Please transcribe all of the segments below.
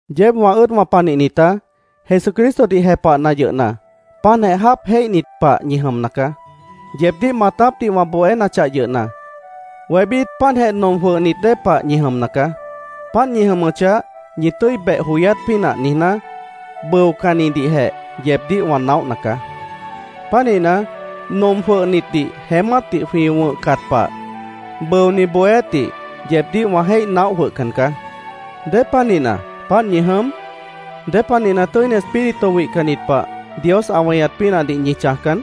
Yeéb wã ʉ́ʉdwã panihnitá, Jesucristodih jepahna yʉhna, páantjeh jáap jéihnit pah ñi jʉmna caá. Yeebdíh maatápdih wã bohénachah yʉhna, wébít páantjeh nom jwʉhnit dée pah ñi jʉmna caá. Páant ñi jʉmʉchah, ñi tʉ́i beh joyát pínah niijná, bʉocannidihjeh yeebdíh wã naóhna caá. Pánihna, nom jwʉhnitdih jeémátdih jwĩ wʉ̃hcat pah, bʉoni bohéátdih yeebdíh wã jéih naóh jwʉhcan caá. ¿Dépanihna, páant ñi jʉm? ¿Dépanihna Tʉ́ini Espíritu wihcannit pah Dios ã weñat pínahdih ñi chãjcan?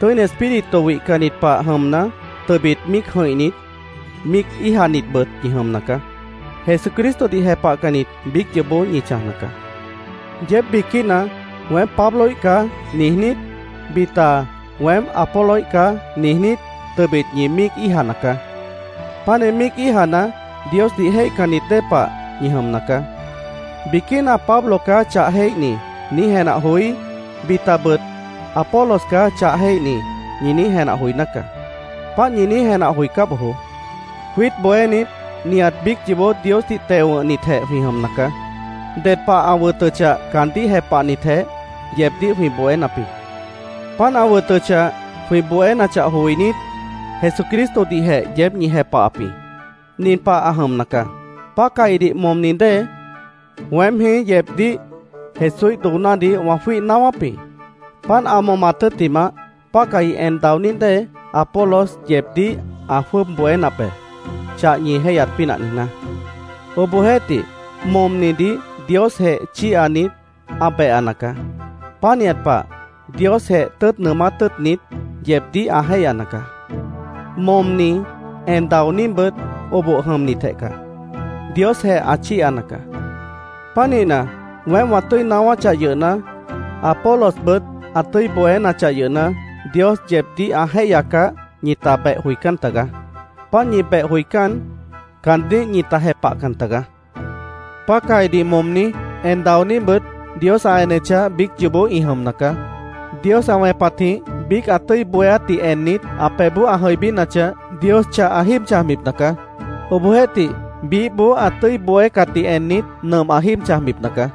Tʉ́ini Espíritu wihcannit pah jʉmna, tʉbit míic jʉ̃ihnit, míic íijanitbʉt ñi jʉmna caá. Jesucristodih jepahcannit biíc yoobó ñi chãjna caá. Yeéb biquína “Weém Pabloíh caá”, niijnít, bita “Weém Apoloíh caá”, niijnít, tʉbit ñi míic íijana caá. Pánih míic íijana, Diosdih jéihcannit dée pah ñi jʉmna caá. Biquína “Pablo caá chah jéihni”, niíj jenah joí, bitabʉt “Apolos caá chah jéihni”, ñi niíj jenah joiná caá. Páant ñi niíj jenah joicá bojoó. Jwiít bohénit nihat biíc yoobó Diosdih teo wʉ̃hnitjeh jwĩ jʉmna caá. Ded pah ã wʉtʉchah, caandíh jepahnitjeh, yeebdíh jwĩ bohénap jĩ. Páant ã wʉtʉchah, jwĩ bohénachah joinít, Jesucristodihjeh yeéb ñi jepahap jĩ. Nin pah ã jʉmna caá: Pácahidih momni dée, weém jĩí yeebdíh Jesúíh doonádih wã jwíih naáwáp jĩ. Páant ã momat tʉ́ttimah, pácahi en daoní dée, Apolos yeebdíh ã jwʉ́ʉb bohénap be, chah ñi jéihyat pínah niijná. Obohjeéhtih, momnidih Diosjeh chíihanit, ã behana caá. Pánihat pah Diosjeh tʉ́ʉt nʉʉmát tʉ́ʉtnit, yeebdíh ã jéihyana caá. Momni, en daoníbʉt oboh jʉmnitjeh caá. Diosjeh ã chíihana caá. Pánihna, weém wã tʉ́i naáwáchah yʉhna, Apolosbʉt ã tʉ́i bohénachah yʉhna, Dios yeebdíh ã jéihyacah, ñita beh joicán tagaá. Páant ñi beh joicán, caandíh ñita jepahcan tagaá. Pácahidih momni, en daoníbʉt, Dios ã enechah, biíc yoobó ĩ jʉmna caá. Dios ã wẽpatjĩh biíc ã tʉ́i bohéátdih ennit, ã pebhboó ã jʉibínachah, Dios chah ã jíib chãjbipna caá. Obohjeéhtih biíhboó ã tʉ́i bohécatdih ennit, nʉmp ã jíib chãjbipna caá.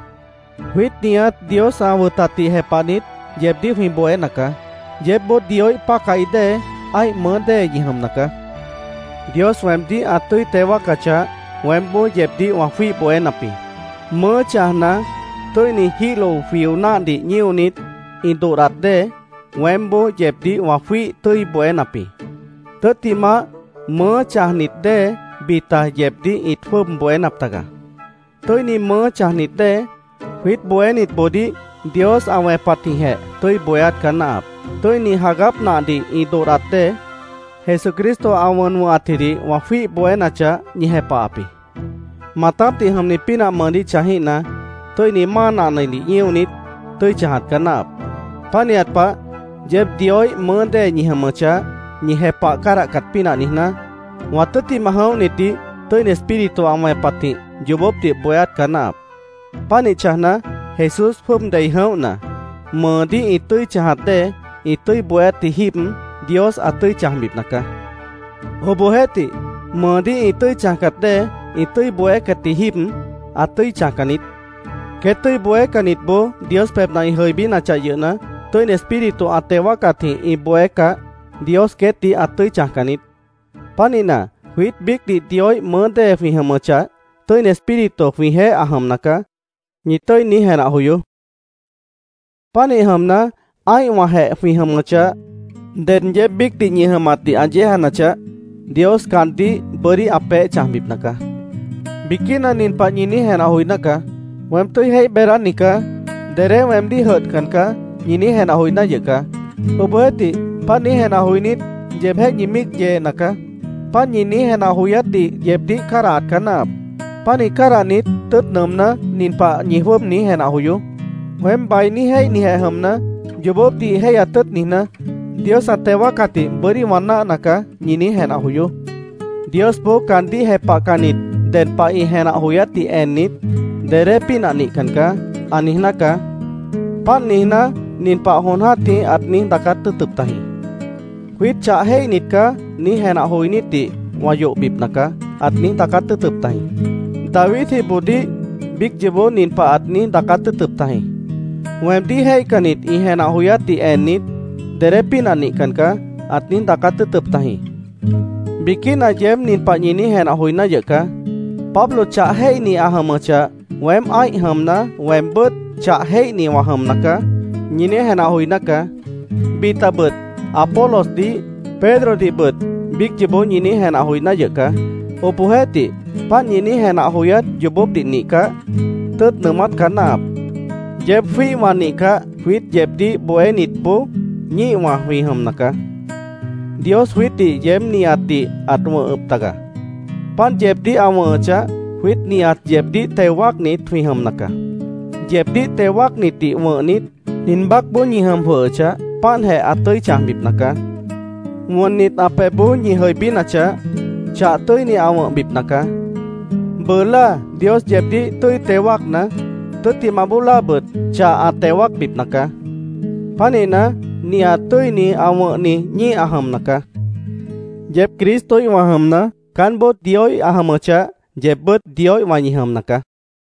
Jwiít nihat Dios ã wʉtatdih jepahnit, yeebdíh jwĩ bohéna caá. Yeébboó Dioíh pácahi dée, ã́ih mʉʉ́ dée ñi jʉmna caá. Dios weemdíh ã tʉ́i teo wáacachah, weémboó yeebdíh wã jwíih bohénap jĩ. Mʉʉ́ chãjna, tʉ́ini jíhlo jwio náhdih ñíonit, ĩ dodhdat dée, weémboó yeebdíh wã jwíih tʉ́i bohénap jĩ. Tʉ́ttimah, mʉʉ́ chãjnit dée bita yeebdíh ĩt jwʉ́ʉb bohénap taga. Tʉ́ini mʉʉ́ chãjnit dée, jwiít bohénitboodíh Dios ã wẽpatjĩhjeh tʉ́i bohéát caá náahap. Tʉ́ini jagáp nahdih ĩ dodhdat dée, Jesucristo ã wʉn wʉ̃hatjidih wã jwíih bohénachah, ñi jepahap jĩ. Maatápdih jʉmni pínah mʉʉdíh chãjíhna, tʉ́ini máa nahnadih ñíonit, tʉ́i chãjat caá náahap. Pánihat pah, yeéb Dioíh mʉʉ́ dée ñi jʉmʉchah, ñi jepah cádahcat pínah niijná, wã tʉ́ttimah jʉ̃óhnitdih Tʉ́ini Espíritu ã wẽpatjĩh yoobópdih bohéát caá náahap. Pánih chãjna, Jesús jwʉ́ʉb dei jʉ̃óhna, mʉʉdíh ĩ tʉ́i chãjat dée, ĩ tʉ́i bohéátji jíib, Dios ã tʉ́i chãjbipna caá. Obohjeéhtih, mʉʉdíh ĩ tʉ́i chãjcat dée, ĩ tʉ́i bohécatji jíib, ã tʉ́i chãjcan niít. Queét tʉ́i bohécannitboó Dios pebhna ĩ jʉibínachah yʉhna, Tʉ́ini Espíritu ã teo wáacatjĩh ĩ bohécah, Dios queétdih ã tʉ́i chãjcan niít. Pánihna, “Jwiít biícdih Dioíh mʉʉ́ dée jwĩ jʉmʉchah, Tʉ́ini Espíritu jwĩjeéh ã jʉmna caá”, ñi niíj tʉ́i jenah joyoó. Pánih jʉmna, ã́ihwãjeh jwĩ jʉmʉchah, ded yeéb biícdih ñi jʉmatdih ã yéejanachah, Dios caandíh bʉ́dí ã peéh chãjbipna caá. Biquína nin pah ñi niíj jenah joiná caá: “Weém tʉ́i jéih beedáni caá. Dedé weemdíh jʉdhcan caá”, ñi niíj jenah joiná yʉh caá. Obohjeéhtih, páant niíj jenah joinít, yeebjéh ñi míic yeena caá. Páant ñi niíj jenah joyátdih yeebdíh cádahat caá náahap. Pánih cádahnit, tʉ́ʉt nʉʉmná, nin pah ñi jwʉ́ʉb niíj jenah joyoó: “Weém bainí jéihnijeh jʉmna, yoobópdih jéihyat tʉ́ʉt niijná, Dios ã teo wáacatdih bʉ́dí wã náahna caá”, ñi niíj jenah joyoó. Diosboó caandíh jepahcannit ded pah ĩ jenah joyátdih ennit, “Dedé pínah nihcan caá”, ã niijná caá. Páant niijná, nin pah jon jã́tih ãt niíj daacát tʉ́ʉtʉp tajĩ: “ ‘Jwiít chah jéihnit caá’, niíj jenah joinítdih wã yohbipna caá”, ãt niíj daacát tʉ́ʉtʉp tajĩ. Davidjiboodíh biíc yoobó nin pah ãt niíj daacát tʉ́ʉtʉp tajĩ: “Weemdíh jéihcannit ĩ jenah joyátdih ennit, ‘Dedé pínah nihcan caá’, ãt niíj daacát tʉ́ʉtʉp tajĩ. Biquína yeéb nin pah ñi niíj jenah joiná yʉh caá: “Pablo chah jéihni ã jʉmʉchah, weém ã́ih jʉmna, weembʉ́t chah jéihni wã jʉmna caá”, ñi niíj jenah joiná caá. Bitabʉt Apolosdih, Pedrodihbʉt biíc yoobó ñi niíj jenah joiná yʉh caá. Obohjeéhtih, páant ñi niíj jenah joyát yoobópdih nihcah, tʉ́ʉt nʉʉmát caá náahap. Yeéb jwĩ́ihwã nihcah, jwiít yeebdíh bohénitboó ñíihwã jwĩ jʉmna caá. Dios jwiítdih yeéb nihatdih ãt wʉ̃hʉp taga. Páant yeebdíh ã wʉ̃hʉchah, jwiít nihat yeebdíh teo wáacnit jwĩ jʉmna caá. Yeebdíh teo wáacnitdih wʉ̃hnit, nin baácboó ñi jʉm jwʉhʉchah, páantjeh ã tʉ́i chãjbipna caá. Wʉnnit, ã pebhboó ñi jʉibínachah, chah tʉ́ini ã wʉ̃hbipna caá. Bʉʉ láa Dios yeebdíh tʉ́i teo wáacna, tʉ́ttimah bóo láabʉt, chah ã teo wáacbipna caá. Pánihna, nihat tʉ́ini ã wʉ̃hni ñíih ã jʉmna caá. Yeéb Cristoíhwã jʉmna, caánboó Dioíh ã jʉmʉchah, yeebbʉ́t Dioíhwã ñi jʉmna caá.